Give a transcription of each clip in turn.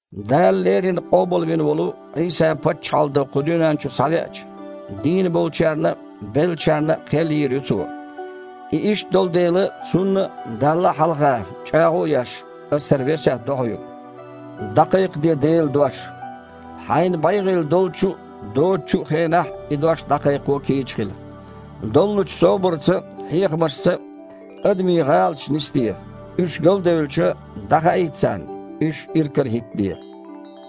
Дала леррина къобалвина волу Іийса паччахьалла дан кху дуьнен чу схьавеача, дийна болчарна а, беллачарна а кхел йийр ю Цо. И иштта долу дела, Цунна а, Далла а хьалха, чІагІо а еш, ас хІара весет до хьоьга: дІакхайкхаде Делан дош. Хьайна бегІийла долчу а, доцучу а хенахь и дош дІакхайкхо кийча хила. Доллучу собарца а, хьехамашца а адамийн гІалаташ нисде, уьш галдевлча, дІахаийта царна, уьш иракарахІиттаде.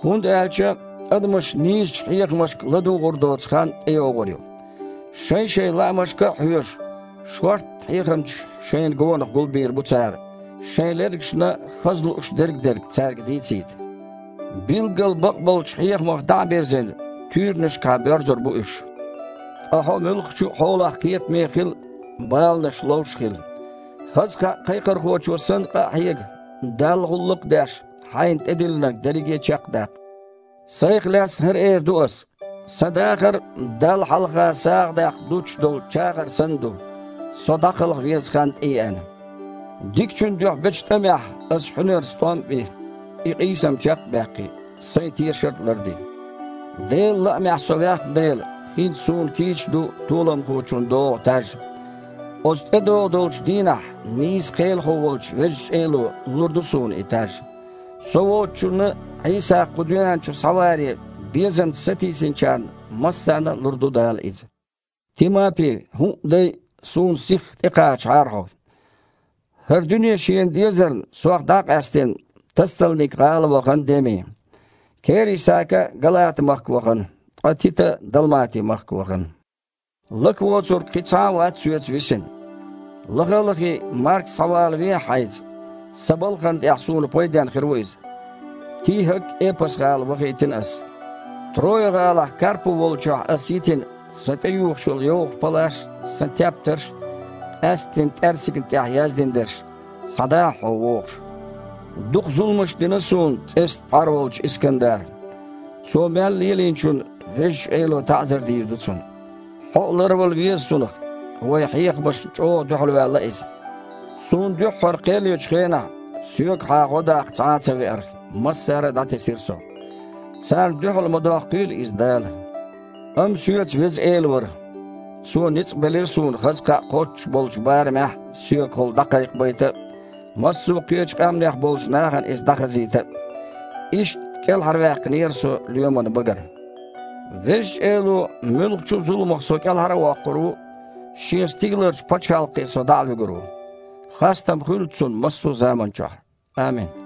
ХІунда аьлча адамаша нийсачу хьехамашка ладугІур доцу хан тІейогІур ю. Шайн-шайн лаамашка а хьоьжуш, шортта хьехамчаш шайна гонах гулбийр бу цара, шайн лергашна хаза лууш дер-дерг цаьрга дийцийта. Билггал бакъболчу хьехамах дІа а бирзина, туьйранашкахьа боьрзур бу уьш. Ткъа хьо муьлххачу а хьолахь кхетаме а хила, баланаш ловш а хила. Хаза кхаъ кхайкхорхочо санна къа а хьега, Далла гІуллакх а деш, хьайна тІедиллинарг дерриге а чекх а даккха. Сайх лаьцна хІара эр ду ас: сан дахар Далла хьалха сагІа даккха дуттуш долу чагІар санна ду – со дІакхалха веза хан тІееана. Дикачун дуьхьа бечу тІамехь ас хьуьнарца тІом а би, и къийсам чекх а баьккхи, сайн тешар а ларди. Делан лаамехь со ваьхна дела, хІинца суна кийча ду толамхочунна догІу таж. Оцу тІедогІун долчу дийнахь нийса Кхелахо волчу Везачу Эло лур ду суна и таж. Со воцучунна а, Іийса кху дуьнен чу схьаваре безамца сатийсиначарна массарна а лур ду Дала иза. Тимапи, хІуъа а дай, суна сихха тІекхачахьара хьо. ХІара дуьне шена дезарна, сох дІа а къаьстина, Тассалник-гІала вахана Деми. Кери-Сака Галата-махка вахана, ткъа Тита Далмати-махка вахана. Лака воцург, кхин цхьа а вац соьца висина. Лаха а лахий, Марк а схьавалавехьа хьайца. Сан балхана тІехь суна пайден хир ву иза. ТихІак Эпас-гІала вахийтина ас. Троя-гІалахь Карпу волчохь ас йитина сан тІеюхуш йолу йовха палаш а, сан тептарш а, къаьсттина тІаьрсигна тІехь яздина дерш, схьадахьа, хьо вогІуш. Дукха зуламаш дина суна цІестан пхьар волчу Искандара. Цо мел лелийначунна Везачу Эло таІзар дийр ду цунна. Хьо а ларвала веза цунах. Вайн хьехамашна чІогІа дуьхьалваьлла иза. Суна дуьххьара кхел ечу хенахь соьгахьа гІо даккха цхьа а ца веара, массара а дІатесира со. Царна дуьхьал ма доккхийла иза Дала! Амма соьца Веза Эла вара. Цо ницкъ белира суна хаза кхаъ кхоччуш болчу барамехь соьгахула дІакхайкхабайта а, массо а кхечу къаьмнех болчу нахана иза дІахазийта а. Иштта кІелхьарваьккхинера со лоьман багара. Везачу Эло муьлххачу а зуламах со кІелхьара а воккхур ву, Шен стигаларчу пачхьалкхе со дІа а вуьгур ву. Хастам хуьлда Цунна массо а заманчохь. Амин.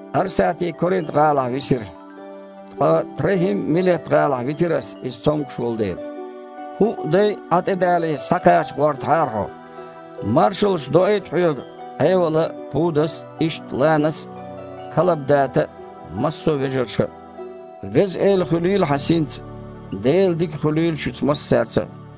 Арсати Коринт-гІалахь висира. Ткъа ТрахІим Милет-гІалахь витира ас, иза цомгуш волу дела. ХІуъа дай а, Іа тІедале, схьакхача гІортахьара хьо. Маршаллаш доуьйту хьоьга Іевала а, Пудас а, иштта Ланас а, Калабдата а, массо а вежарша а. Веза Эла хуьлийла хьан синца. Делан дика хуьлийла шуьца массаьрца а.